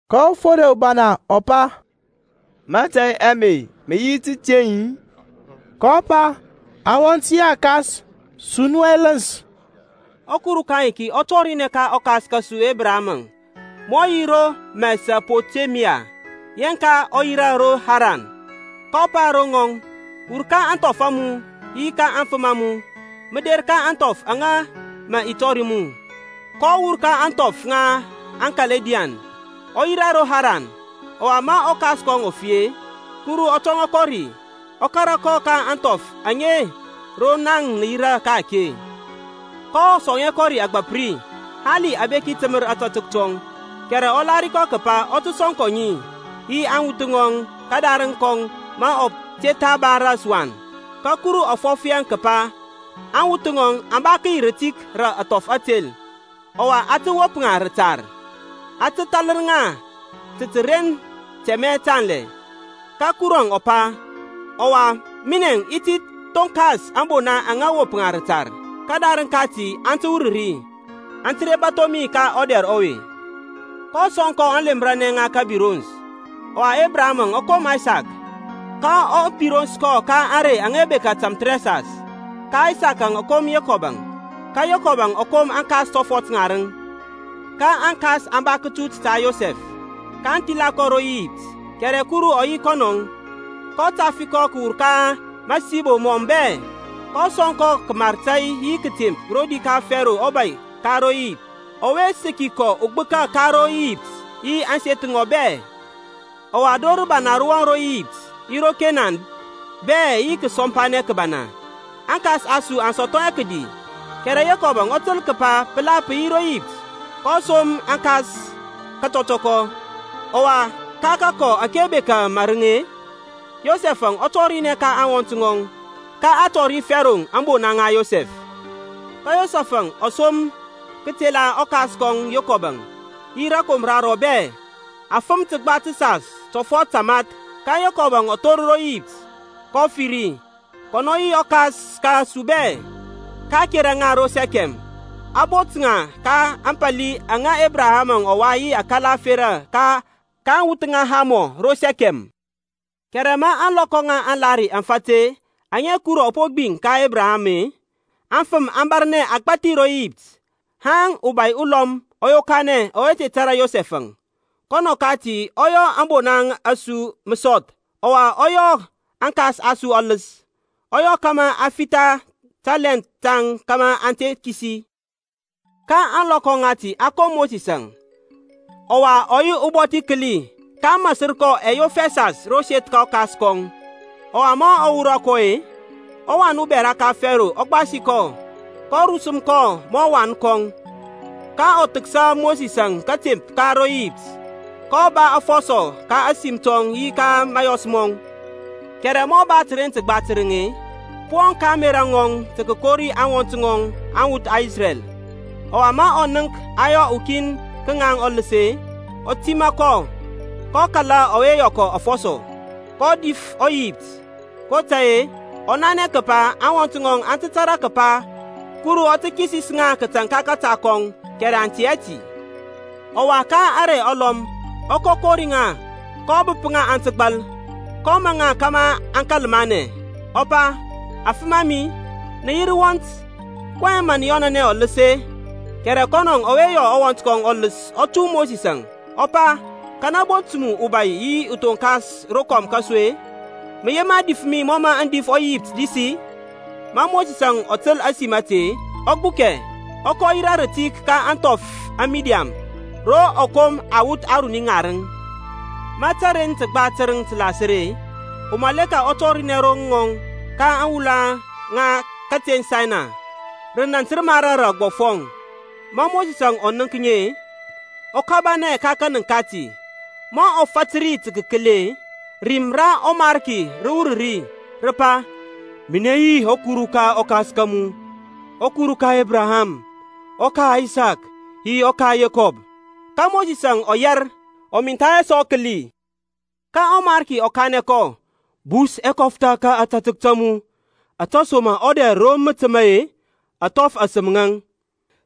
Ka ɔfode ubana ɔ pa, Mȧtȧy ame mə yi tateŋ-i? kɔ pa, Awɔnt yi akas, su nu ɛləns. ƆKuru ka ayiki ɔ tɔrinɛ ka ɔkas kȧsu Ebraham ma ɔ yi ro Mesopotemia yeŋka ɔ yirȧ ro Haran, kɔ pa ro ŋɔŋ, Wur ka ȧŋthɔf a mu, yi ka aŋfəm a mu, mə der ka ȧŋthɔf aŋa mə i tɔri mu. kɔ wur ka ȧŋthɔf ŋa aŋKaldiyan, ɔ yirȧ ro Haran; ɔwa ma ɔkas kɔŋ ɔ fi-e, Kuru ɔ tɔŋa kɔ ri, ɔ kȧrȧ kɔ ka ȧŋthɔf aŋe ro naŋ nə yirȧ ka-ake. kɔ sɔŋ hɛ kɔ ȧgbȧp ri, hali abeki təmər akatək kɔŋ, kɛrɛ ɔ lahiri kəpa ɔ tə sɔŋ kɔ ŋi, yi aŋwuth ŋɔŋ kədarəŋ kɔŋ ma ɔ te tha ba ras wan. Ka Kuru ɔ fɔf yaŋ kəpa aŋwuth ŋɔŋ aŋ ba kəyi rə rətik rə athɔf ȧtel, ɔwa aŋ tə wop ŋa rətar, aŋ tə thalər ŋa ta təren tɛmɛ tanlɛ. Ka Kurɔŋ ɔ pa, Ɔwa minɛŋ i ti thonkas ȧŋbona aŋa mə wop ŋa rətar; kədarəŋ kati aŋ tə wur ri, aŋ tə re bȧtho mi ka ɔdɛr ɔwe. kɔ sɔŋ kɔ aŋlemranɛ ŋa kabirons; ɔwa Ebraham ɔ kom Aysak, ka a birons kɔ ka ȧŋrey aŋa bekȧ tamthərɛsas; ka Aysak ɔ kom Yekɔb-əŋ, ka Yekɔb ɔ kom aŋkas tɔfɔt ŋarəŋ. Ka aŋkas aŋ ba kətut ta Yosɛf, kaŋ thila kɔ ro Iyipt; kɛrɛ Kuru ɔ yi yi kɔnɔŋȧŋ, kɔ tafi kɔ kəwur ka masibo mɔŋ bɛ, kɔ sɔŋ kɔ kəmar tȧy yi kətemp rodi ka Fero ɔbȧy ka ro Iyipt; ɔwe səki kɔ ugbəka ka ro Iyipt yi ȧŋseth ŋɔŋ bɛ. Ɔwa dor rəbana rə wɔŋ ro Iyipt yi ro Kenan bɛ yi kəsɔmpanɛ kəbana. Aŋkas a su aŋ sɔthɔ hɛ kədi. Kɛrɛ Yekɔb ɔ təl kəpa pəla pə yi ro Iyipt, kɔ som aŋkas ka katɔtɔkɔ. Ɔwa ka kakɔ ȧke bekȧ marəŋ-e, Yosɛf ɔ tɔrinɛ ka aŋwɔnt ŋɔŋ; ka a tɔri Fero ȧŋbona ŋa Yosɛf. Ka Yosɛf-əŋ ɔ som kətela ɔkas kɔŋ Yekɔb, yi rȧkomra rɔŋ bɛ, afəm təgba təsas tɔfɔt tamath. Ka Yekɔb ɔ thor ro Iyipt, kɔ fi ri, kɔnɔ yi aŋkas a su bɛ; ka a kera ŋa ro Sɛkɛm, a bot ŋa ka ȧŋpȧli aŋa Ebraham ɔ wai yi akala ȧferȧ ka aŋwuth ŋa Hamɔ ro Sɛkɛm. Kɛrɛ ma ȧŋlɔkɔ ŋa aŋlahiri aŋ fat-e aŋa Kuru ɔ po gbiŋ ka Ebraham-e, aŋfəm aŋ bȧrnɛ agbȧthi ro Iyipt, haŋ ubȧy ulɔm ɔ yokanɛ ɔwe te tȧrȧ Yosɛf-əŋ. Kɔnɔ kati ɔ yɔ ȧŋbona a su məsɔth, ɔwa ɔ yɔ aŋkas a su ɔləs, ɔ yɔ kȧmȧ aŋ fitha talɛnth taŋ kȧmȧ aŋ te kisi. Ka ȧŋlɔkɔ ŋati a kom Mosisȧŋ, ɔwa ɔ yi ubɔthi kəli; ka a masər kɔ yof ɛsas ro seth ka ɔkas kɔŋ. Ɔwa ma a wurɔ kɔ-e, ɔwan ubɛra ka Fero ɔ gbasi kɔ, kɔ rusəm kɔ mɔ uwan kɔŋ. Ka a thəksa Mosisȧŋ kȧtemp bɛ ka aŋIyipt, kɔ ba afɔsɔ ka ȧsim tɔŋ yi ka mȧyɔs mɔŋ. Kɛrɛ ma ɔ ba təren təgba tərəŋ-e, pə wɔŋ ka ȧŋmerȧ ŋɔŋ tə kəkori aŋwɔnt ŋɔŋ aŋwuth ŋa Isrɛl. Ɔwa ma ɔ nənk a yɔ ukin ka ŋaŋ afɔsɔ-e, ɔ tima kɔ, ɔ kala ta ɔwe a yɔ afɔsɔ, kɔ dif ɔIyipt kotȧy-e ɔ nanɛ kəpa aŋwɔnt ŋɔŋ aŋ tə tȧrȧ kəpa Kurɔŋ ɔ tə kisis ŋa ka kȧta kɔŋ kɛrɛ aŋ tɛ hɛ ti. Ɔwa ka ȧŋrey alɔm ɔ kɔ kori ŋa kɔ bəp ŋa aŋ tə gbal, kɔ maŋ ŋa kȧmȧ aŋ kȧl manɛ, ɔ pa, Afəm a mi, na yi rəwɔnt, kɔyɛŋ mə nə yɔnanɛ ɔləs-e? Kɛrɛ kɔnɔ ɔwe yɔ ɔwɔnt ɔləs ɔ nɔt Mosisȧŋ, ɔ pa, Kanɛ bot mu ubȧy yi uthoŋkas rokɔm ka su-e? Mə yema dif mi mɔ mȧ mə dif ɔEyipt dis-i? Ma Mosisȧŋ ɔ təl ȧsim ȧte-e, ɔ gbukɛ, ɔ kɔ yirȧ rətik ka ȧŋthɔf ŋa Midian, ro ɔ kom awuth aruni ŋarəŋ. Ma təren təgba tərəŋ tə lasər-e, umaleka ɔ tɔrinɛ ro rɔŋɔŋ ka aŋwula ŋa kateŋ Saynay, rə nȧnt nə mara rə agbɔfɔŋ. Ma Mosisȧŋ ɔ nənk ŋi-e, ɔ kabanɛ ka kȧnənk kati; ma ɔ fȧtər ri tə kəkəli-e, rim ra ɔMarki rə wur ri, rə pa, Minɛ yi ɔKuru ka aŋkas a mu, ɔKuru ka Ebraham, ɔka Aysak, yi ɔka Yekɔbȧŋ. Ka Mosis ɔ yɛr, ɔ mintha hɛ sɔ kəli. Ka ɔMarki ɔ kanɛ kɔ, Bus ɛkɔftha ka ȧtȧtək ta mu, ȧtesoma-e ɔdɛr ro mə təma-e, athɔf asəm ŋaŋ.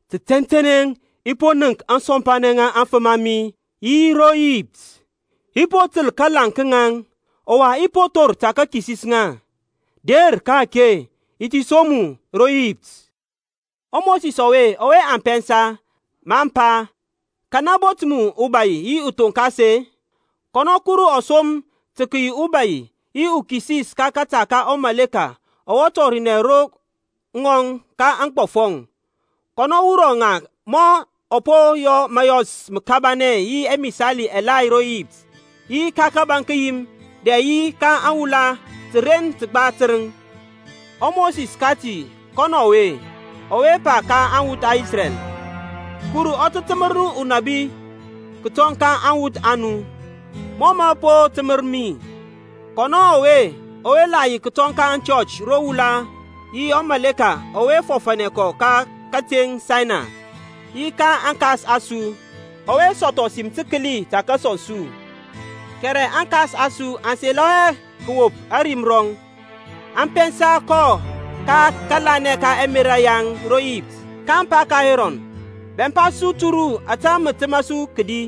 Tə tɛntɛnɛ i po nənk ȧŋsɔmpanɛ ŋa aŋfəm a mi aŋa yi ro Iyipt, i po təl kalaŋ ka ŋaŋ, ɔwa i po thor tə kəkisis ŋa. Der ka-ake, i ti som mu ro Iyipt. ƆMosisȧŋ ɔwe aŋ pɛnsa, maŋ pa, Kanɛ bot mu ubȧy yi uthonkas-e? Kɔnɔ Kuru ɔ som tə kəyi ubȧy yi ukisis ka kȧta ka ɔmaleka ɔwe tɔrinɛ ro ŋɔŋ ka aŋgbɔfɔŋ. Kɔnɔ wurɔ ŋa ma ɔ po yɔ məyɔs məkabanɛ yi ɛmisali ɛgbathi ro Iyipt-e, yi ka kȧbȧŋ kəyim, dɛ yi ka aŋwula təren təgba tərəŋ. ƆMosis kati kɔnɔ ɔwe, ɔwe pa ka aŋwuth ŋa Isrɛl, Kuru ɔ tə təmər nu unabi kətɔŋ ka aŋwɔnt a nu, mɔ mɔ po təmər mi; kɔnɔ ɔwe la yi kətɔŋ ka aŋchɔch ro wula yi ɔmaleka ɔwe fɔfȧnɛ kɔ ka kateŋ Saynay, yi ka aŋkas a su; ɔwe sɔthɔ sim təkəli tə kəsɔŋ su. Kɛrɛ aŋkas a su aŋ selɔ hɛ tə kəwop ȧrim rɔŋ, aŋ pɛnsa kɔ kaŋ kȧla ɛmerȧ yaŋ ro Iyipt, kaŋ pa ka Erɔn, Bɛmpa su turu ȧtȧ mə təmȧ su kədi,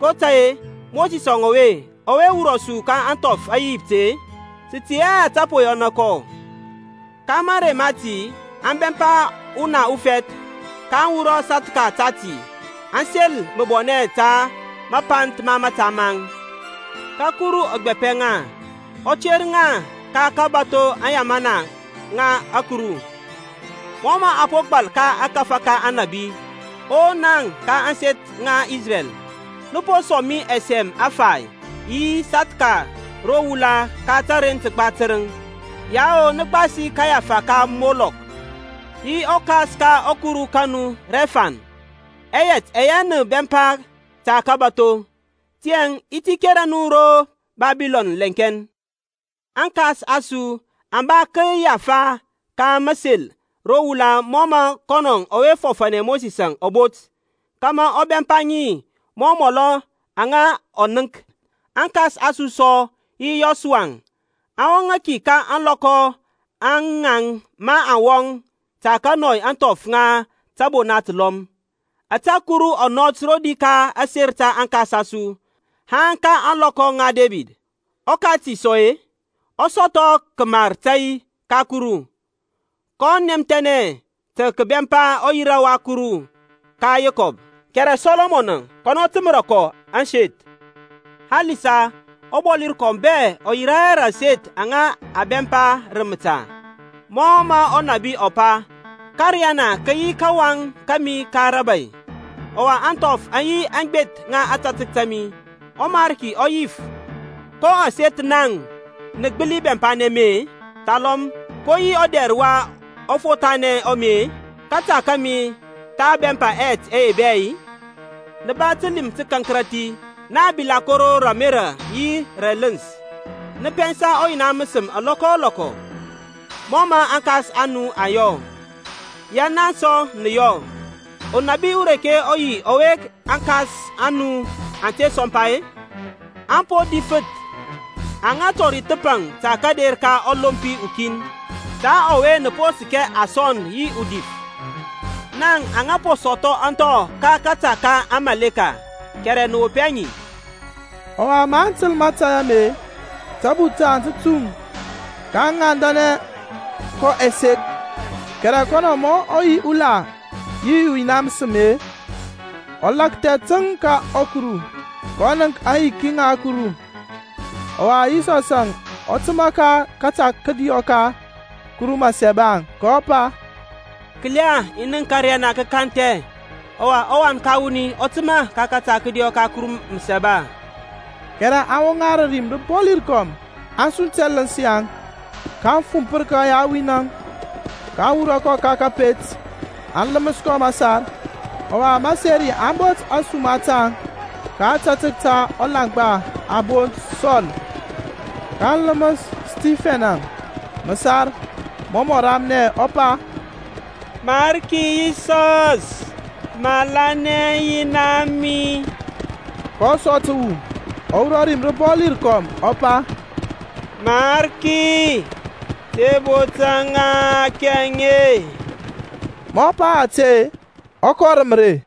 kotȧy-e Mosisȧŋ ɔwe ɔwɔ wurɔ su ka ȧŋthɔf ŋa Iyipt-e, sə tɛ hɛ ȧte po yɔ kɔ. Ka marey mati aŋ bɛmpa una ufɛth, kaŋ wurɔ asathka tati, aŋ sel məbɔnɛ ta mapanth ma mȧta maŋ. Ka Kuru ɔ gbapɛ ŋa, ɔ ter ŋa ka kabȧtho aŋyamana ŋa ȧkuru, mɔ mə a po gbal ka ȧkȧfȧ ka Aŋnȧbi, o naŋ ka ȧŋseth ŋa Isrɛl, nə po sɔŋ mi ɛsɛm ɛfay Yi sathka ro wula ka təren təgba tərəŋ-i? Yao nə gbasi aŋgbafa ŋ Molɔk, Yi akɔs ka ɔkuru ka nu Rɛfan, Ɛyɛt ɛyɛ nə bɛmpa tə kəbatho; Tiyȧŋ i ti kera nu ro Babilɔn lɛŋkɛn. Aŋkas a su aŋ ba agbafa ŋa məseri ro wula mɔ mə kɔnɔ ɔwe fɔfȧnɛ Mosisȧŋ ɔ bot, kȧmȧ ɔ bɛmpa ŋi mɔ amɔl aŋa ɔ nənk. Aŋkas a su sɔ yi Yɔsua aŋ wɔŋȧ ki ka ȧŋlɔkɔ a ŋaŋ maŋ wɔŋ tə kənɔi ȧŋthɔf ŋa tȧbona təlɔm, ȧtȧ Kuru ɔ nɔt rodi ka aser ta aŋkas a su, haŋ ka ȧŋlɔkɔ ŋa Debid. Ɔkati sɔ-e, ɔ sɔthɔ kəmar tȧy ka Kuru, kɔ nɛmthɛnɛ tə kəbɛmpa ɔyira ta ɔKuru ka Yekɔb. Kɛrɛ Sɔlɔmɔnȧŋ kɔnɔ təməra kɔ aseth; halisa ɔBɔli rəkɔm bɛ ɔ yirȧ hɛ rə aseth aŋa mə a bɛmpa rə məta; mɔ mə ɔnȧbi ɔ pa, Ȧkȧriyana kə yi kawaŋ kȧmi ka rəbȧy, Ɔwa ȧŋthɔf aŋ yi aŋgbeth ŋa ȧtȧtək ta mi. ƆMariki ɔ yif, Ko aseth naŋ nə gbəli bɛmpanɛ mi-e? Thalɔm ko yi ɔdɛr wa ɔfothanɛ ɔ mi-e? Kȧta kȧmi tha bɛmpa ɛyɛt ɛye bɛ-i? Na ba təlim tə kȧnkərȧthi, na aŋbilakoro rə ȧmerȧ yi rə ɛləns, nə pɛnsa ɔYina məsəm alɔkɔ o lɔkɔ. Mɔ mə aŋkas a nu aŋ yɔ, ya naŋ sɔ nə yɔ. Unabi ureke ɔ yi ɔwe aŋkas a nu aŋ te sɔmpa-e? Aŋ po difəth ŋa aŋa tɔri thəpaŋ ta kȧder ka ɔLompi ukin; ta ɔwe naŋ nə po səkɛ aŋsɔnd yi adif. Naŋ aŋa po sɔthɔ ȧŋthɔ ka kȧta ka amaleka, kɛrɛ nə wop hɛ ŋi. Ɔwa maŋ təl mȧtȧy ame-e, tabuth taŋ tə tuŋ, kaŋ ŋandanɛ kɔ ɛsek. Kɛrɛ kɔnɔ ma ɔ yi ula yi ɔYina məsəm-e, ɔ lakthɛ təŋ ka ȧkuru, kɔ nənk aŋyiki ŋa Kuru, ɔwa Yisɔsȧŋ ɔ təmȧ ka kȧta kədiɔ ka Kuru Məsaba, kɔ pa, Kəla i nənk ȧkȧriyana kə kanthɛ, ɔwa ɔWan ka wuni ɔ təmȧ ka kȧta kədiɔ ka Kuru Məsaba. Kɛrɛ aŋ woŋa rə rim rəbɔli rəkɔm, aŋ sunt ɛləns yaŋ, kaŋ fumpər kɔ yawin-əŋ. kaŋ wurɔ kɔ ka kȧpet, aŋ ləməs kɔ məsar. Ɔwa maseri aŋ bot ȧsuma taŋ ka ȧtȧtək ta ulaŋgba a bont Sɔl. kaŋ ləməs Stifɛn-əŋ məsar, mɔ mɔ ramnɛ, ɔ pa, Mariki Yisɔs malanɛ aŋyina a mi. kɔ sɔ təwu, ɔ wurɔ rim rəbɔli rəkɔm, ɔ pa, Mariki, te botȧ ŋa aŋhakɛ aŋe. Ma ɔ pa ȧte-e ɔ kɔ rə mərey.